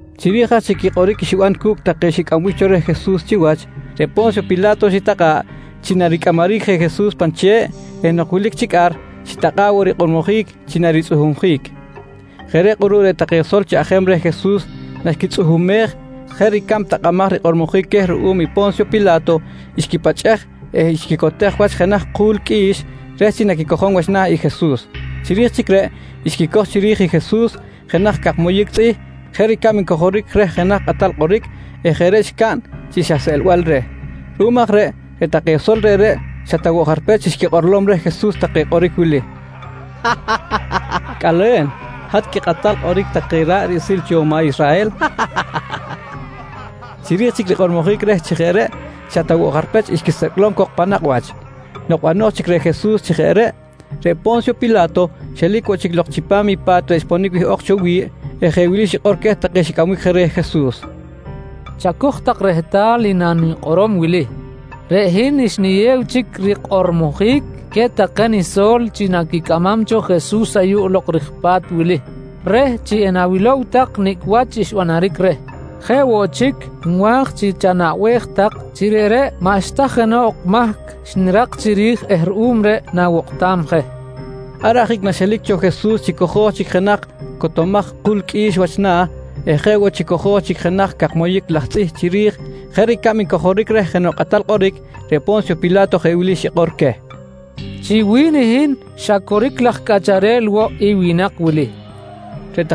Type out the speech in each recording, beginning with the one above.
Chiri̱j aj chic i kꞌoric xiban cu̱cꞌ take xcꞌambic cho reh Jesus chiwach, reꞌ Po̱nsyo Pila̱to xitakꞌa̱ꞌ chi naricꞌamaric je Jesus pan che̱ꞌ eh nok wilic chic ar, xitakꞌa̱ꞌ woꞌ rikꞌormojic chi naritzꞌuhumjic. Jeꞌ reꞌ kꞌuruꞌ reꞌ take sol chaꞌjem reh Jesus naxquitzꞌuhumej jeꞌ ricab takꞌamaj rikꞌormojic queh ruꞌum i Po̱nsyo Pila̱to, xquipachꞌej eh xquicotej wach jenaj ku̱l qꞌui̱x reh chi naquicojom wach na̱ i Jesus. Chiri̱j chic reꞌ xquicoj chiri̱j i Jesus jenaj cak moyic tzꞌih jeꞌ ricab ncojoric reh jenaj kꞌatal kꞌoric eh jeꞌ reꞌ xcaꞌn chi xa seꞌlbal reh. Ruꞌum aj reꞌ, reꞌ take sol reꞌreꞌ xa ta woꞌ jarpech xquikꞌorlom reh Jesus take kꞌoric wili: «Cꞌale̱n, hat quikꞌatal kꞌoric take ra̱ꞌ riꞌsil cho maꞌ Israhel! nqui xa nqui chic take cok reh. Chiri̱j chic rikꞌormojic reh chi jeꞌ reꞌ xa ta woꞌ jarpech xquisecꞌlom cok pan nakꞌ wach. Nok bano̱j chic reh Jesus chi jeꞌ reꞌ, reꞌ Po̱nsyo Pila̱to xelic woꞌ chic lok chipam i pa̱t xponic wihꞌok cho wi̱ꞌ eh jeꞌ wili xikꞌor queh take xicꞌambic je reh Jesus: «Chacoj tak rehtal i nanikꞌorom wili: Reꞌ hin xniyew chic rikꞌormojic queh take niso̱l chi naquicꞌamam cho Jesus ayuꞌ lok ri̱j pa̱t wili reh chi na̱wilom tak nicꞌ wach xbanaric reh. Jeꞌ woꞌ chic, nwa̱j chi chanaꞌbej tak chi reꞌreꞌ maꞌxta jenoꞌ mahc xnirak chiri̱j eh ruꞌum reꞌ nawokꞌtam je, nqui queh. Ar ajic naxelic cho Jesus chi cojo̱j chic jenaj cotomaj ku̱l qꞌui̱x wach na̱ eh jeꞌ woꞌ chi cojo̱j chic jenaj cak moyic laj tzꞌih chiri̱j jeꞌ ricab ncojoric reh jenoꞌ kꞌatal kꞌoric, reꞌ Po̱nsyo Pila̱to jeꞌ wili xikꞌor queh: «Chi wi̱n hin, xa coric laj cꞌacharel woꞌ i winak wili, nqui queh.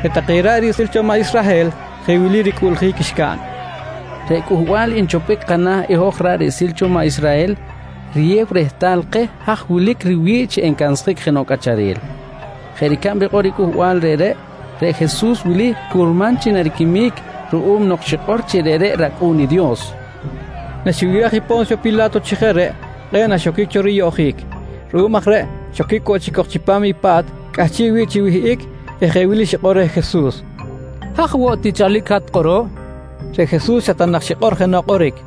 Reꞌ take ra̱ꞌ riꞌsil cho maꞌ Israhel jeꞌ wili ricꞌuꞌljic xcaꞌn: «Reꞌ cꞌuhbal nchopbic kana̱ i hoj ra̱ꞌ riꞌsil cho maꞌ Israhel riyew rehtal keh haj wilic riwi̱ꞌ chi encansjic jenoꞌ cꞌacharel. Jeꞌ ricab rikꞌor i cꞌuhbal reꞌreꞌ, reꞌ Jesus wili curman chi nariquimic ruꞌum nok xikꞌor chi reꞌreꞌ rAcꞌu̱n i Dios, nqui take. Naxibiraj i Po̱nsyo Pila̱to chi jeꞌ reꞌ kꞌe̱ꞌ naxoquic cho riyoꞌjic. Ruꞌum aj reꞌ xoquic woꞌ chic cok chipam i pa̱t cꞌahchiꞌ wi̱ꞌ chi wihꞌic eh jeꞌ wili xikꞌor reh Jesus: «Haj woꞌ tichalic i hat kꞌuruꞌ? nqui reh. Reꞌ Jesus xa ta nak xikꞌor jenoꞌ kꞌoric.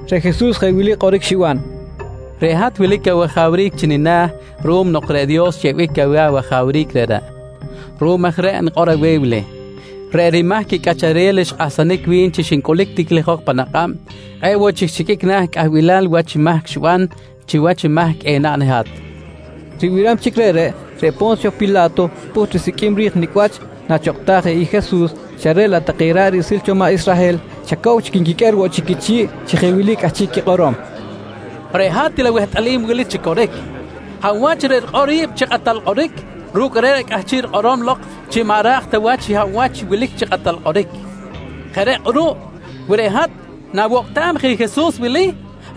Reꞌ Jesus jeꞌ wili kꞌoric xiban: «Reꞌ hat wilic awajawric chi nina̱ ruꞌum nok reꞌ Dios xyeꞌbic aweh awajawric reꞌreꞌ. Ruꞌum aj reꞌ nikꞌor aweh wili: Reꞌ rimahc i cꞌacharel xkꞌahsanic wi̱n chi xincꞌulic tiklijok pan akꞌab, kꞌe̱ꞌ woꞌ chic xiqꞌuic na̱ cꞌahbilal wach mahc xiban chiwach i mahc enaꞌn i hat, nqui reh. Ribiram chic reꞌreꞌ, reꞌ Po̱nsyo Pila̱to pꞌuht risiqꞌuim ri̱j nicꞌ wach nachokꞌtaj je i Jesus, xa reꞌ laꞌ reꞌ take ra̱ꞌ riꞌsil cho maꞌ Israhel xa cow chic nquiqꞌuer woꞌ chic quichi̱ꞌ chi jeꞌ wili cꞌahchiꞌ quikꞌorom: «Reꞌ hat til awehtꞌalim i wili chi coric: Hab wach reꞌ rikꞌor ri̱b chi kꞌatal kꞌoric, ru̱cꞌ reꞌreꞌ cꞌahchiꞌ rikꞌorom lok chi maꞌ ra̱j ta wach i hab wach wilic chi kꞌatal kꞌoric. Jeꞌ reꞌ kꞌuruꞌ wi reꞌ hat nawokꞌtam je i Jesus wili,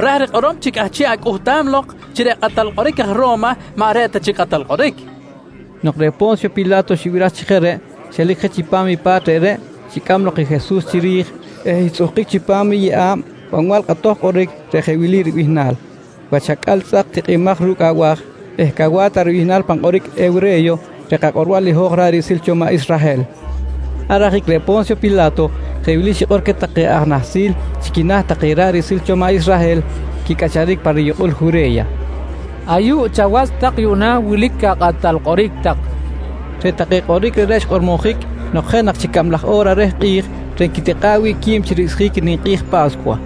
ra̱j rikꞌorom chi cꞌahchiꞌ acꞌuhtam lok chi reꞌ kꞌatal kꞌoric aj Ro̱ma maꞌ reꞌ ta chic i kꞌatal kꞌoric, nqui take. Nok reꞌ Po̱nsyo Pila̱to xibiraj chi jeꞌ reꞌ, xelic je chipam i pa̱t reꞌreꞌ, xicꞌam lok i Jesus chiri̱j eh xtzꞌuhkic chipam i yeꞌa̱b banbal kꞌatoj kꞌoric reꞌ jeꞌ wili ribihnal: “Wach Acꞌal Tzꞌak Tikꞌimaj ru̱cꞌ Abaj” eh “Cawa̱ta” ribihnal pan kꞌoric hewre̱yo reꞌ kakꞌorbal i hoj ra̱ꞌ riꞌsil cho maꞌ Israhel. Ar ajic reꞌ Po̱nsyo Pila̱to jeꞌ wili xikꞌor queh take aj nahsil chi quina̱ take ra̱ꞌ riꞌsil cho maꞌ Israhel quicꞌacharic pa riyukꞌul Jure̱ya: «Ayuꞌ chawach tak yuꞌna wilic akꞌatal kꞌoric tak, nqui queh. Reꞌ take kꞌoric reꞌreꞌ xkꞌormojic nok jeꞌ nak chic cablaj o̱ra reh kꞌi̱j reꞌ nquitikꞌa̱ꞌ wi̱ꞌ qui̱b chi ricꞌsjic i ninkꞌi̱j Pa̱scuwa.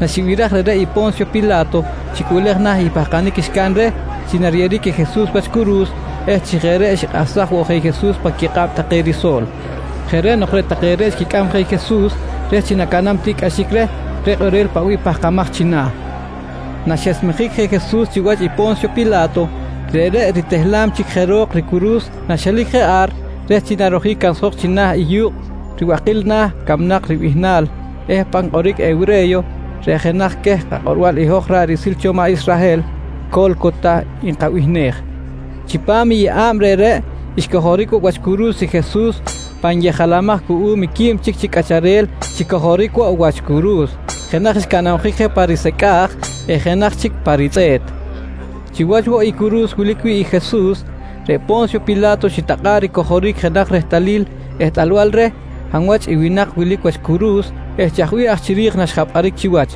Naxibiraj reꞌreꞌ i Po̱nsyo Pila̱to xicꞌuꞌlej na̱ i pahkanic xcaꞌn reh chi nariyeꞌeric i Jesus wach curu̱s eh chi jeꞌ reꞌ xikꞌahsaj woꞌ i Jesus pan quikꞌab take riso̱l. Jeꞌ reꞌ nok reꞌ take reꞌ xquicꞌam je i Jesus reh chi nacaꞌnam tiꞌcꞌaxic reh reꞌ kꞌorel paꞌ bih pahkamaj china̱. Naxesmejic je Jesus chiwach i Po̱nsyo Pila̱to, reꞌreꞌ ritehlam chic je ro̱k ricuru̱s naxelic je ar reh chi narojic cansjok china̱ i yu̱kꞌ “Ribakil Na̱ Camnak” ribihnal eh pan kꞌoric hewre̱yo reꞌ jenaj queh kakꞌorbal i hoj ra̱ꞌ riꞌsil cho maꞌ Israhel, “Co̱lcota” nkabihnej. Chipam i yeꞌa̱b reꞌreꞌ xcojoric wach curu̱s i Jesus, pan yejalamaj cuꞌum i quib chic chi cꞌacharel xicojoric woꞌ wach curu̱s. Jenaj xcanabjic je pa risecꞌa̱j eh jenaj chic pa ritzꞌe̱t. Chiwach woꞌ i curu̱s wilic wi̱ꞌ i Jesus, reꞌ Po̱nsyo Pila̱to xitakꞌa̱ꞌ ricojoric jenaj rehtalil ehtꞌalbal reh hab wach i winak wilic wach curu̱s eh chaj bih aj chiri̱j naxjapꞌaric chiwach.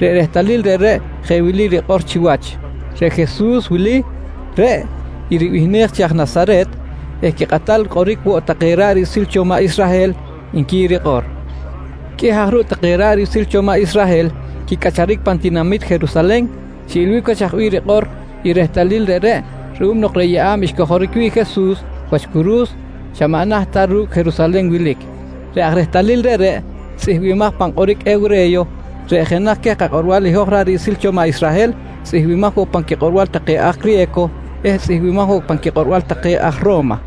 Reꞌ rehtalil reꞌreꞌ jeꞌ wili rikꞌor chiwach: “Reꞌ Jesus wili, reꞌ i ribihnej chi aj Nasaret eh quikꞌatal kꞌoric woꞌ take ra̱ꞌ riꞌsil cho maꞌ Israhel, nqui rikꞌor. Qꞌuih aj ruꞌ take ra̱ꞌ riꞌsil cho maꞌ Israhel quicꞌacharic pan tinamit Jerusalen, xiꞌilbic wach chaj bih rikꞌor i rehtalil reꞌreꞌ ruꞌum nok reꞌ yeꞌa̱b xcojoric wi̱ꞌ i Jesus wach curu̱s, xa maꞌ naht ta ru̱cꞌ Jerusalen wilic. Reꞌ aj reꞌ rehtalil reꞌreꞌ tzꞌihmbimaj pan kꞌoric hewre̱yo reꞌ jenaj queh kakꞌorbal i hoj ra̱ꞌ riꞌsil cho maꞌ Israhel, tzꞌihmbimaj woꞌ pan quikꞌorbal take aj criye̱co eh tzꞌihmbimaj woꞌ pan quikꞌorbal take aj Ro̱ma.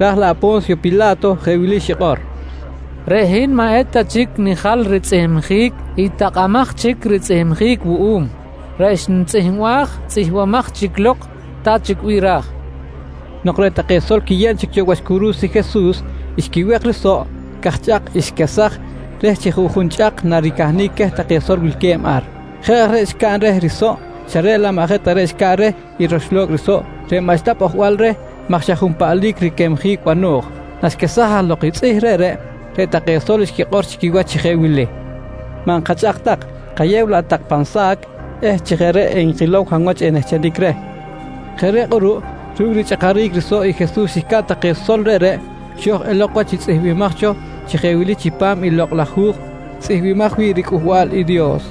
Raj laꞌ Po̱nsyo Pila̱to jeꞌ wili xikꞌor: «Reꞌ hin maꞌ eta chic nijal ritzꞌihmjic i takꞌamaj chic ritzꞌihmjic wuꞌum, reꞌ xnitzꞌihmbaj, tzꞌihmbimaj chic lok ta chic bih ra̱j, nqui queh. Nok reꞌ take sol quiyeb chic cho wach curu̱s i Jesus, xquiwek i risoꞌ, cajchꞌak xquesaj reh chi juꞌjun chꞌak naricahnic queh take sol wilque̱b ar. Jeꞌ aj reꞌ xcaꞌn reh risoꞌ xa reꞌ laꞌ maꞌ jeꞌ ta reꞌ xcaꞌn reh i roxlo̱cꞌ risoꞌ reꞌ maꞌxta pꞌojbal reh maj xa junpaꞌlic riquemjic bano̱j. Naxquesaj aj lok i tzꞌih reꞌreꞌ, reꞌ take sol xquikꞌor chi quiwach chi jeꞌ wili: «Maꞌ nkachꞌak tak, kayew laꞌ tak pan sa̱c eh chi jeꞌ reꞌ enkilow hab wach enehchenic reh, nqui take. Jeꞌ reꞌ kꞌuruꞌ ru̱cꞌ richꞌakaric risoꞌ i Jesus xcaꞌn take sol reꞌreꞌ, xo̱j elok wach i tzꞌihmbimaj cho chi jeꞌ wili chipam i Lokꞌ laj Hu̱j tzꞌihmbimaj wi̱ꞌ riCꞌuhbal i Dios: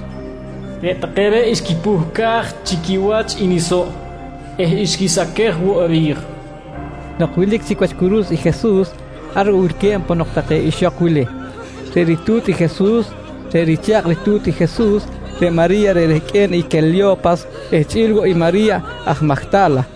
“Reꞌ take reꞌ xquipuhcaj chi quiwach i nisoꞌ eh xquisaquej woꞌ ri̱j, nqui rikꞌor. Nok wilic chic wach curu̱s i Jesus, ar woꞌ wilque̱b ponok take ixok wili: Reꞌ ritu̱t i Jesus, reꞌ richa̱kꞌ ritu̱t i Jesus, reꞌ Mari̱ya reꞌ rehqꞌue̱n i Quelyo̱pas eh chꞌi̱l woꞌ i Mari̱ya aj Majta̱la.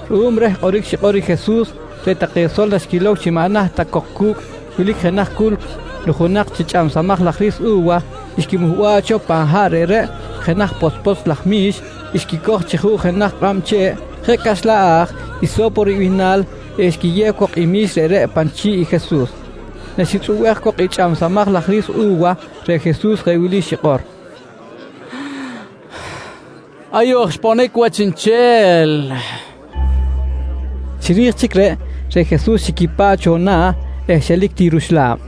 Ruꞌum reh kꞌoric xikꞌor i Jesus, reꞌ take sol naxquilow chi maꞌ naht ta cok cu̱cꞌ wilic jenaj culc nujunak chi chꞌamsamaj laj ri̱s u̱wa, xquimuhba̱ꞌ cho pan haꞌ reꞌreꞌ jenaj potzpotz laj mi̱x, xquicoj chi juꞌ jenaj kꞌab che̱ꞌ jeꞌ caxlan a̱j “iso̱po” ribihnal eh xquiyew cok i mi̱x reꞌreꞌ pan chi̱ꞌ i Jesus. Naxitzꞌubej cok i chꞌamsamaj laj ri̱s u̱wa, reꞌ Jesus jeꞌ wili xikꞌor: «Ayuꞌ aj xponic wach chiꞌnchel, nqui xikꞌor. Chiri̱j chic reꞌ, reꞌ Jesus xiquipa̱ꞌ cho na̱ eh xelic ti ruxla̱b.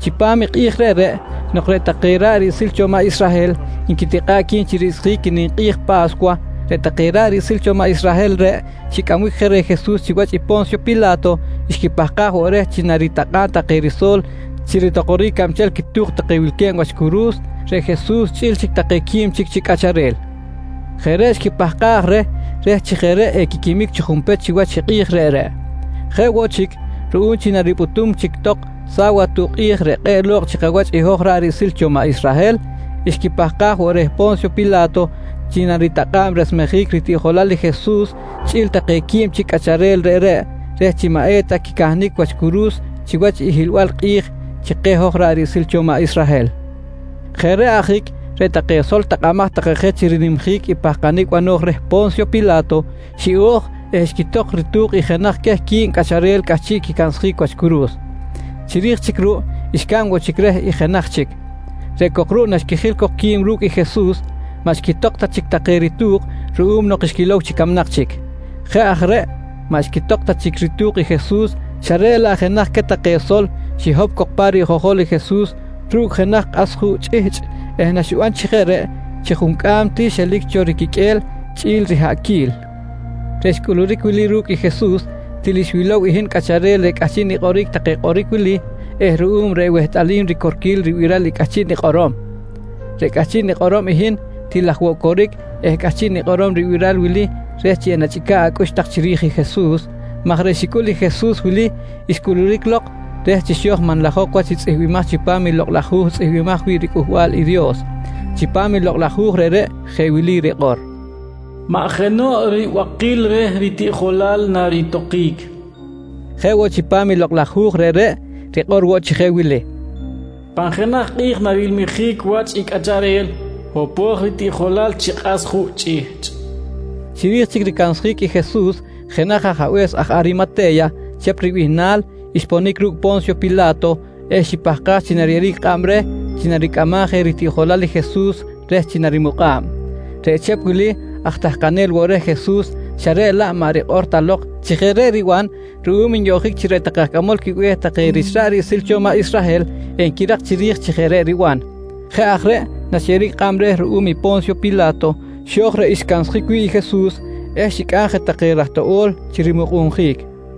Chipam i kꞌi̱j reꞌreꞌ nok reꞌ take ra̱ꞌ riꞌsil cho maꞌ Israhel nquitikꞌa̱ꞌ qui̱b chi ricꞌsjic i ninkꞌi̱j Pa̱scuwa, reꞌ take ra̱ꞌ riꞌsil cho maꞌ Israhel reꞌ xicꞌambic je reh Jesus chiwach i Po̱nsyo Pila̱to xquipahkaj woꞌ reh chi naritakꞌa̱b take riso̱l chi ritokoric cabchel quitu̱k take wilque̱b wach curu̱s, reꞌ Jesus chꞌi̱l take quib chic chi cꞌacharel. Jeꞌ reꞌ xquipahkaj reh, reh chi jeꞌ reꞌ equiquimic chi junpech chiwach i kꞌi̱j reꞌreꞌ. Jeꞌ woꞌ chic, ruꞌum chi naripꞌutum chic tok sawatuꞌ kꞌi̱j reꞌ kꞌe̱ꞌ lo̱kꞌ chikawach i hoj ra̱ꞌ riꞌsil cho maꞌ Israhel, xquipahkaj woꞌ reh Po̱nsyo Pila̱to chi naritakꞌa̱b resmejic ritiꞌjolal i Jesus chꞌi̱l take quib chic cꞌacharel reꞌreꞌ, reh chi maꞌ eta quicahnic wach curu̱s chiwach i hiꞌlbal kꞌi̱j chi keh hoj ra̱ꞌ riꞌsil cho maꞌ Israhel. Jeꞌ reꞌ ajic, reꞌ take sol takꞌamaj take je chi rinimjic i pahkanic bano̱j reh Po̱nsyo Pila̱to, xiꞌo̱j eh xquitok ritu̱k i jenaj queh quib cꞌacharel cꞌahchiꞌ quicansjic wach curu̱s. Chiri̱j chic ruꞌ xcaꞌn woꞌ chic reh i jenaj chic, reꞌ cok ruꞌ naxquijil cok qui̱b ru̱cꞌ i Jesus, maꞌ xquitok ta chic take ritu̱k ruꞌum nok xquilow chi camnak chic. Jeꞌ aj reꞌ maꞌ xquitok ta chic ritu̱k i Jesus xa reꞌ laꞌ jenaj queh take sol xihop cok pa rijojol i Jesus ru̱cꞌ jenaj kꞌas juꞌ chꞌihchꞌ eh naxiban chi jeꞌ reꞌ, chi juncꞌam ti xelic cho riquiqꞌue̱l chꞌi̱l i rihaꞌquil. Reꞌ xcꞌuluric wili ru̱cꞌ i Jesus til xwilow i hin cꞌacharel reꞌ cꞌahchiꞌ nikꞌoric take kꞌoric wili eh ruꞌum reꞌ wehtꞌalim ricorquil ribiral i cꞌahchiꞌ nikꞌorom. Reꞌ cꞌahchiꞌ nikꞌorom i hin, til aj woꞌ coric eh cꞌahchiꞌ nikꞌorom ribiral wili reh chi enachꞌica̱ꞌ acꞌux tak chiri̱j i Jesus, maj reꞌ xicꞌul i Jesus wili, xcꞌuluric lok reh chi xo̱j manlajok wach i tzꞌihmbimaj chipam i Lokꞌ laj Hu̱j tzꞌihmbimaj wi̱ꞌ riCꞌuhbal i Dios. Chipam i Lokꞌ laj Hu̱j reꞌreꞌ jeꞌ wili rikꞌor: “Maꞌ jenoꞌ ribakil reh ritiꞌjolal naritokic, nqui rikꞌor. Jeꞌ woꞌ chipam i Lokꞌ laj Hu̱j reꞌreꞌ rikꞌor woꞌ chi jeꞌ wili: “Pan jenaj kꞌi̱j narilmijic wach i cꞌacharel hopo̱j ritiꞌjolal chi kꞌas juꞌ chꞌihchꞌ, nqui woꞌ rikꞌor. Chiri̱j chic ricansjic i Jesus, jenaj ajabe̱s aj Arimate̱ya, Chep ribihnal, xponic ru̱cꞌ Po̱nsyo Pila̱to eh xipahkaj chi nariyeꞌeric kꞌab reh chi naricꞌamam je ritiꞌjolal i Jesus reh chi narimukꞌa̱b. Reꞌ Chep wili aj tahkanel woꞌ reh Jesus xa reꞌ laꞌ maꞌ rikꞌor ta lok chi jeꞌ reꞌ riban ruꞌum nyoꞌjic chi reꞌ take aj cꞌamol quibe̱h take rich ra̱ꞌ riꞌsil cho maꞌ Israhel enquirak chiri̱j chi jeꞌ reꞌ riban. Jeꞌ aj reꞌ naxyeꞌeric kꞌab reh ruꞌum i Po̱nsyo Pila̱to, xo̱j reꞌ xcansjic wi̱ꞌ i Jesus eh xicꞌam je take raj toꞌo̱l chi rimukꞌunjic.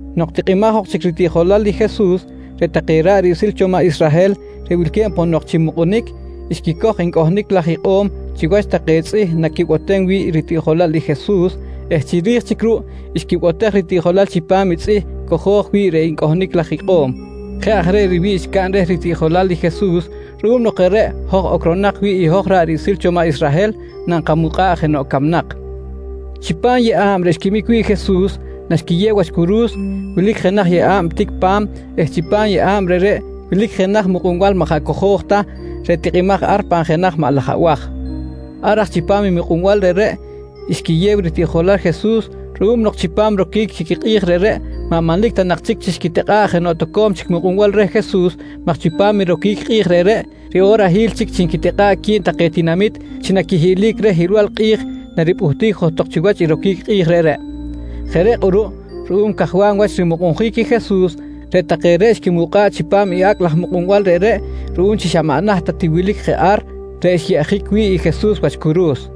Nok tikꞌimaj ok chic ritiꞌjolal i Jesus, reꞌ take ra̱ꞌ riꞌsil cho maꞌ Israhel reꞌ wilque̱b ponok chi mukꞌunic, xquicoj ncꞌohnic laj ikꞌo̱m chiwach take tzꞌih naquibotem wi̱ꞌ ritiꞌjolal i Jesus eh chiri̱j chic ruꞌ xquibotej ritiꞌjolal chipam i tzꞌih cojo̱j wi̱ꞌ reꞌ ncꞌohnic laj ikꞌo̱m. Jeꞌ aj reꞌ riwi̱ꞌ xcaꞌn reh ritiꞌjolal i Jesus ruꞌum nok jeꞌ reꞌ hoj ocronak wi̱ꞌ i hoj ra̱ꞌ riꞌsil cho maꞌ Israhel nankamukꞌa̱ꞌ je jenoꞌ camnak. Chipam i yeꞌa̱b reꞌ xquimic wi̱ꞌ i Jesus naxquiyew wach curu̱s, wilic jenaj yeꞌa̱b tic pa̱m eh chipam i yeꞌa̱b reꞌreꞌ wilic jenaj mukꞌunbal maꞌ jaꞌ cojo̱j ta, reꞌ tikꞌimaj ar pan jenaj maꞌ laj abaj. Ar aj chipam i mukꞌunbal reꞌreꞌ, xquiyew i ritiꞌjolal i Jesus ruꞌum nok chipam roquic i kꞌi̱j reꞌreꞌ maꞌ manlic ta nak chic chi xquitikꞌa̱ꞌ jenoꞌ toco̱m chic mukꞌunbal reh Jesus maj chipam i roquic kꞌi̱j reꞌreꞌ, riꞌorahil chic chi nquitikꞌa̱ꞌ qui̱b take tinamit chi naquihiꞌlic reh hiꞌlbal kꞌi̱j naripꞌuhtic johtok chiwach i roquic kꞌi̱j reꞌreꞌ. Jeꞌ reꞌ kꞌuruꞌ ruꞌum cajwam wach rimukꞌunjic i Jesus, reꞌ take reꞌ xquimukꞌa̱ꞌ chipam i acꞌ laj mukꞌunbal reꞌreꞌ ruꞌum chi xa maꞌ naht ta ti wilic je ar reꞌ xyeꞌjic wi̱ꞌ i Jesus wach curu̱s.